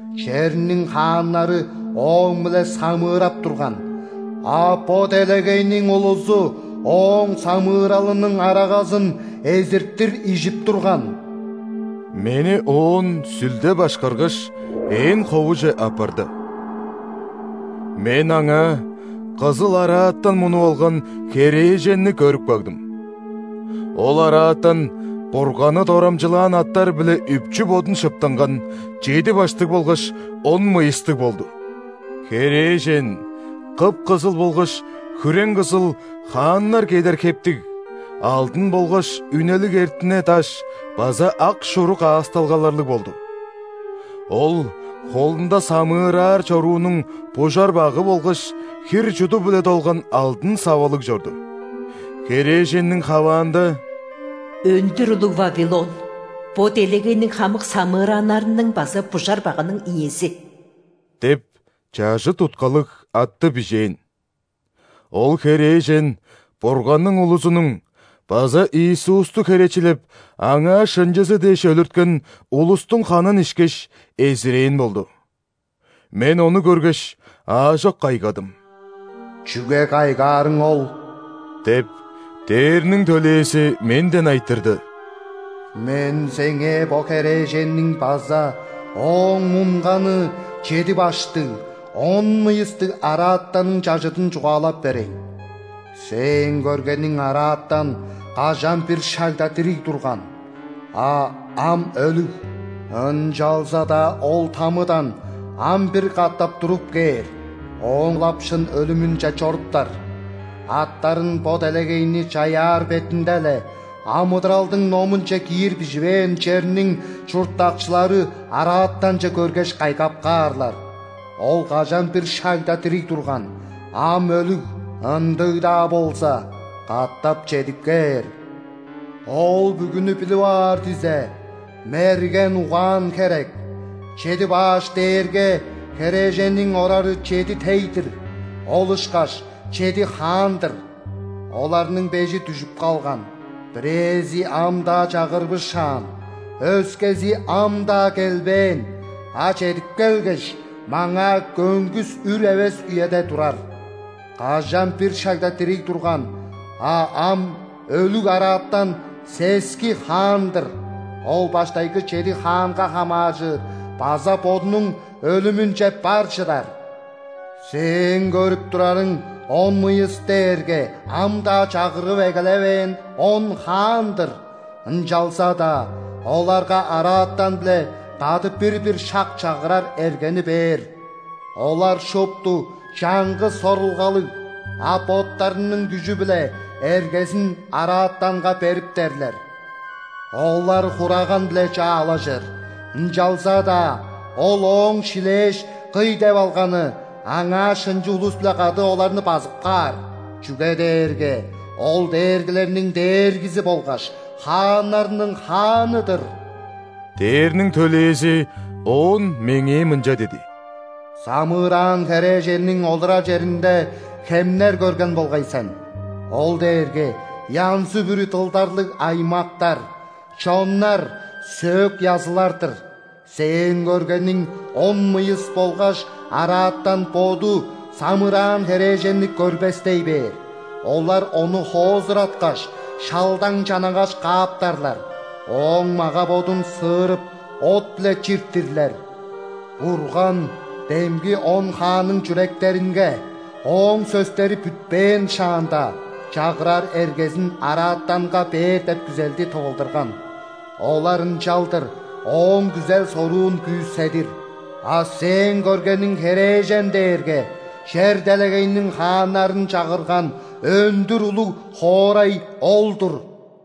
Черниң хааннары ооң-биле самыырап турган, а бо делегейниң улузу ооң самыыралының арагазын эзиртир ижип турган». Мени оон Сүлде башкаргаш, ээн ховуже аппарды. Мен аңаа кызыл араатан мунуп алган херээженни көрүп кагдым. Ол араатан Бурганны дорамчылаан аттар-биле үпчү бодун шыптынган, чеди баштыг болгаш он мыйыстыг болду. Херээжен кып-кызыл болгаш хүрең-кызыл хааннар кедер хептиг, алдын болгаш үнелиг эртине даш база ак шуру каасталгаларлыг болду. Ол холунда самыыраар чоруунуң бужар-багы болгаш хир-чуду-биле долган алдын савалыг чорду. Херээженниң хаваанда: «Өндүр улуг Вавилон, бо делегейниң хамык самыырааннарының база бужар-багының иези» – деп чажыт уткалыг атты бижээн. Ол херээжен Бурганның улузунуң база Иисусту херечилеп, Аңаа шынчызы дээш өлүрткен улустуң ханын ишкеш, эзирээн болду. Мен ону көргеш, аажок кайгадым. «Чүге кайгаарың ол? – деп, ·дээрниң төлээзи менден айтырды. – Мен сеңээ бо херээженниң база ооң мунганы чеди баштыг, он мыйыстыг араатанның чажыдын чугаалап берейн. Сээң көргениң араатан кажан-бир шагда дириг турган, а ам өлүг. Ынчалза-даа ол ·тамыдан ам бир катап туруп кээр, оон ылап шын өлүмүнче чоруптар. Аттарын бо делегейни чаяар бетинде-ле амыдыралдың номунче киир биживээн черниң чурттакчылары араатанче көргеш, кайгап каарлар: ол кажан-бир шагда дириг турган, ам өлүг, ындыг-даа болза, катап чедип кээр. Ол бүгүнү билип аар дизе, мерген угаан херек. Чеди баш дээрге херээженниң орары чеди тей-дир, ол ышкаш чеди хаан-дыр. Оларның бежи дүжүп калган, бирээзи ам-даа чагырбышаан, өскези ам-даа келбээн, а чедип келгеш, маңаа көңгүс үр эвес үеде турар. Кажан-бир шагда дириг турган, а ам өлүг араатан – сески хаан-дыр. Ол баштайгы чеди хаанга хамааржыр база бодунуң өлүмүнче бар чыдар. Сээң көрүп турарың он мыйыс дээрге ам-даа чагырып эгелевээн он хаан-дыр. Ынчалза-даа оларга араатан-биле кады бир-бир шак чагырар эргени бээр. Олар шупту чаңгыс сорулгалыг, а боттарының күжү биле эргезин араатанга бериптерлер. Олар Хураган-биле чаалажыр, ынчалза-даа Ол Ооң шилээш, кый деп алганы, Аңаа шынчы улус-биле кады оларны базып каар. Чүге дээрге Ол дээргилерниң Дээргизи болгаш хааннарның Хааны-дыр». Дээрниң төлээзи оон меңээ мынча диди: «Самыыраан херээженниң олурар черинде хемнер көрген болгай сен. Ол дээрге янзы-бүрү дылдарлыг аймактар, чоннар, сөөк-язылар-дыр. Сээң көргениң он мыйыс болгаш араатан боду самыыраан херээженни көрбестей бээр. Олар ону хоозураткаш, шалдаң-чанагаш кааптарлар, ооң мага-бодун сыырып, от-биле чиртирлер. Бурган демги он хаанның чүректеринге, Ооң сөстери бүтпээн шаанда, чагырар эргезин араатанга бээр деп күзелди тывылдырган. Олар ынчалдыр Ооң күзел-соруун күүседир. А сээң көргениң херээжен дээрге чер-делегейниң хааннарын чагырган өндүр улуг хоорай ол-дур».